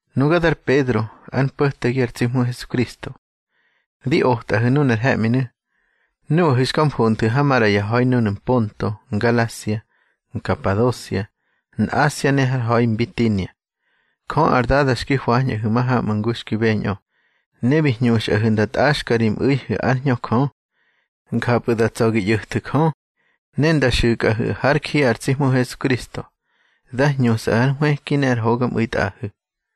Nuga dar Pedro, ár mpo̱tegi ar tsi Hmu Hesukristo. Di otꞌahu̱ nunar he̱ꞌminu̱, nuꞌahu̱ xka mfonthu̱ ha maꞌra ya ha̱i núnu̱ Mponto, Ngalasia, Nkapadosia, Nꞌasia ne har ha̱i Mbitinia. Jö ar Dada xki hwañꞌahu̱ ya mahamꞌu̱ ngu xki beñꞌö, ne bi hñuxꞌahu̱ nda tꞌaxkꞌa ri mꞌu̱ihu̱ ár Hñö Jö. Njapꞌu̱ da tsa̱ gi ꞌyo̱thu̱ Jö, ne nda xu̱kꞌahu̱ hár ji ar tsi Hmu Hesukristo. Dá hñusꞌa ar nhwëki ne ar hogamꞌu̱i tꞌaꞌahu̱.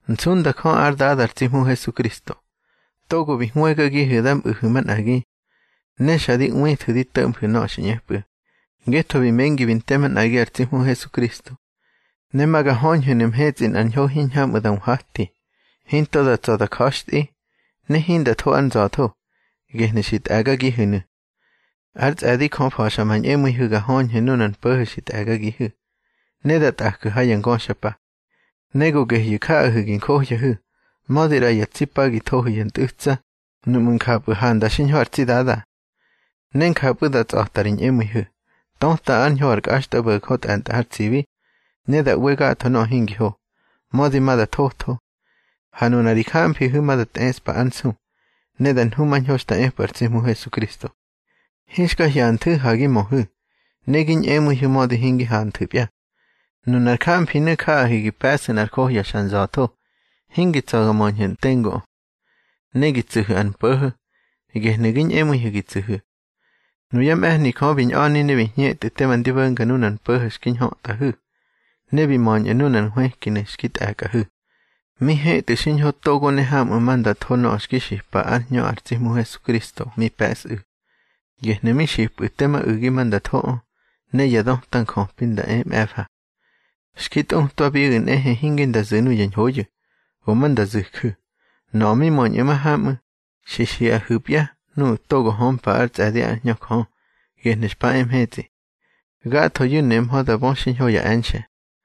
Nsunda Jö ár Dada ar tsi Hmu Hesukristo, togo bi hwëgagihu̱ da mꞌu̱hu̱ manꞌagi. Ne xa di ꞌwithu̱ di to̱ꞌmhu̱ nöꞌö xi ꞌñepꞌu̱, ngetho bi mengi bi nte manꞌagi ar tsi Hmu Hesukristo. Ne ma ga höñhu̱nu̱ mhetsꞌi nꞌar ñho hiñhamꞌu̱ da nhwati, hinto da tsa̱ da ja̱xtꞌi, ne hinda tho ár nza̱tho. Gehnu̱ xi tꞌe̱gagihu̱nu̱. Ár tsꞌe̱di Jö fa̱xa ma ñꞌemu̱ihu̱ ga höñhu̱ nunar mpo̱ho̱ xi tꞌe̱gagihu̱, ne da tꞌaju̱ ha ya ngöxapa. Ne go gehyu̱ jaꞌahu̱ gi njohyahu̱, mödi ꞌra ya tsi pa gi thohu̱ ya ntꞌu̱tsa, nuꞌmu̱ njapꞌu̱ handa xiñho ar tsi Dada. Ne njapꞌu̱ da tsꞌa̱tꞌa ri ñꞌemu̱ihu̱, töta ár ñho ar kꞌaxtꞌabo̱jö tꞌe̱ntꞌa har tsibi, ne da ꞌwe gatho nöꞌö hingi ho, mödi ma da thotho. Ha nuna ri jamfihu̱nu̱ ma da tꞌeꞌspa ár nsu, ne da nhumañho xta epꞌu̱ ar tsi Hmu Hesukristo. Hinxka hyanthu̱ ha gi möhu̱, ne gi ñꞌemu̱ihu̱ mödi hingi hanthu̱pya. Nunar jamfinu̱ jaꞌahu̱ gi pe̱ꞌsu̱ nꞌar johya xa nza̱tho, hingi tsa̱ ga möñhu̱ tenguꞌö. Ne gi tsu̱hu̱ ar mpo̱ho̱, gehnu̱ gi ñꞌemu̱ihu̱ gi tsu̱hu̱. Nuyá mꞌe̱hni Jö bi ñꞌa̱ni ne bi hñetꞌu̱ tema ndi bo̱nga nunar mpo̱ho̱ xki ñhötꞌahu̱, ne bi möñꞌu̱ nunar nhwëkinu̱ xki tꞌe̱kꞌahu̱. Mi hetꞌu̱ xiñho togo ne hamꞌu̱ ma nda tho nöꞌö xki xipa ár Hñö ar tsi Hmu Hesukristo mi pe̱sꞌu̱. Gehnu̱ mi xipꞌu̱ tema u̱gi ma nda thoꞌö, ne ya döta njöpi nda e mꞌe̱fa. Xki tꞌutwabiꞌu̱ nehe hinge nda zu̱ nuya ñhoyu̱, go ma nda zu̱ju̱. Nöꞌö mi möñꞌu̱ mahamꞌu̱, xi xiꞌahu̱pya nuꞌu̱ togo hömpa ár tsꞌe̱di ár Hñö Jö, gehnu̱ xpa e mhetsꞌi. Gathoyu̱ nemhö da bö xiñho ya e̱nxe̱.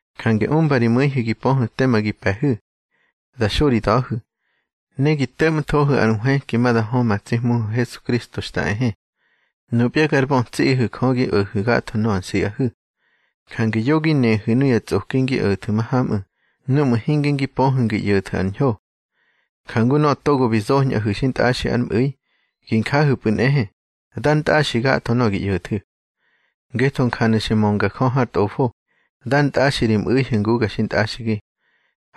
Jange umba ri mu̱ihu̱ gi pöhu̱ tema gi pe̱hu̱. Da xo ri da̱hu̱, ne gi to̱ꞌmthohu̱ ar nhwëki ma da hö ma tsi Hmuhu̱ Hesukristo xta ehe. Nupya gar bötsiꞌihu̱ Jö gi o̱hu̱ gatho nöꞌö nsiꞌahu̱. Jange yo gi nehu̱ nuya tsꞌoki ngi o̱thu̱ mahamꞌu̱ núꞌmu̱ hinge ngi pöhu̱ ngi ꞌyo̱thu̱ ar ñho. Jangu nöꞌö togo bi zoñꞌahu̱ xintꞌaxi ár mꞌu̱i, gi njahu̱pꞌu̱ nꞌehe, dár ntꞌaxi gatho nöꞌö gi ꞌyo̱thu̱. Ngetho njanu̱ xi mönga Jö har Tꞌofo: Dár ntꞌaxi ri mꞌu̱ihu̱ nguga xintꞌaxigi.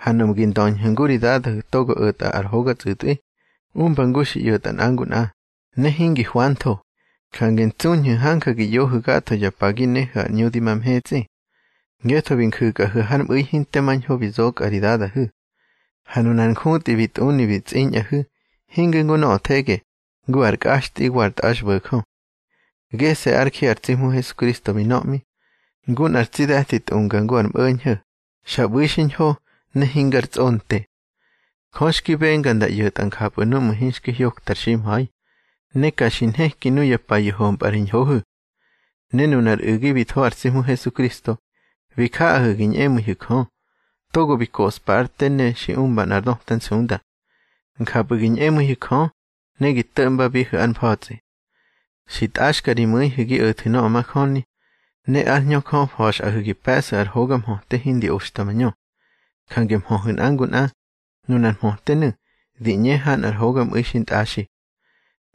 Ha nuꞌmu̱ gi ndöñhu̱ ngu ri Dadahu̱ togo o̱tꞌa ar hoga tsꞌu̱tꞌwi, umba ngu xi ꞌyo̱tꞌa nꞌa ngu nꞌa, ne hingi hwantho; jange ntsuñhu̱ hanja gi ꞌyohu̱ gatho ya pa gi nehu̱ ar ꞌñu di ma mhetsꞌi. Ngetho bi nju̱kꞌahu̱ har mꞌu̱i hinte mar ñho bi zokꞌa ri dadahu̱. Ha nunar njutꞌi bi tꞌuni bi tsꞌiñꞌahu̱, hinge ngu nöꞌö thege, ngu ar kꞌaxtꞌi wa ar tꞌaxbo̱jö. Gese̱ ár ji ar tsi Hmu Hesukristo bi nöꞌmi, ngu nꞌar tsi de̱ti tꞌunga ngu ar mꞌo̱ñho̱, xa ꞌbu̱i xiñho ne hingar tsꞌonte. Jö xki benga nda ꞌyo̱tꞌa njapꞌu̱ núꞌmu̱ hinxki hyokta ar ximha̱i, ne ka xi nheki nuya payu̱ hompꞌa ri ñhohu̱. Ne nuna ar u̱gi bi tho ar tsi Hmu Hesukristo, bi jaꞌahu̱ gi ñꞌemu̱ihu̱ Jö, togo bi koꞌspa ár te ne xi umba nꞌar döta nsunda. Njapꞌu̱ gi ñꞌemu̱ihu̱ Jö, ne gi to̱ꞌmbabihu̱ ár mfa̱tsꞌi. Xi tꞌaxka ri mu̱ihu̱ gi o̱thu̱ nöꞌö majöni, ne ár Hñö Jö fa̱xꞌahu̱ gi pe̱ꞌsu̱ ar hoga mhöte hindi oxta mañö. Jange mhöhu̱ nꞌa ngu nꞌa. Nunar mhötenu̱ di ꞌñe ha nꞌar hogamu̱i xintꞌaxi.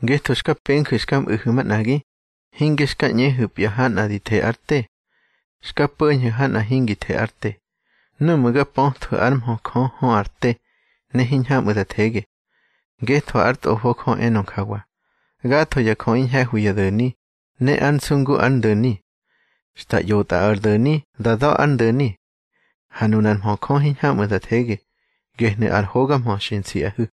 Ngetho xka penju̱ xka mꞌu̱hu̱ manꞌagi. Hinge xka ꞌñehu̱pya ha nꞌa di the ár te. Xka po̱ñhu̱ ha nꞌa hingi the ár te, núꞌmu̱ ga pöthwu̱ ár mhö Jö hö ar te ne hiñhamꞌu̱ da thege. Ngetho hár Tꞌofo Jö enö njawa: Gatho ya jöꞌi ñhe̱hwi ya do̱ni, ne ár nsu ngu ár ndo̱ni. Xta ꞌyotꞌa ar do̱ni da da̱ ár ndo̱ni. Ha nunár mhö Jö hiñhamꞌu̱ da thege. Gehnu̱ ar hoga mhö xi nsiꞌahu̱.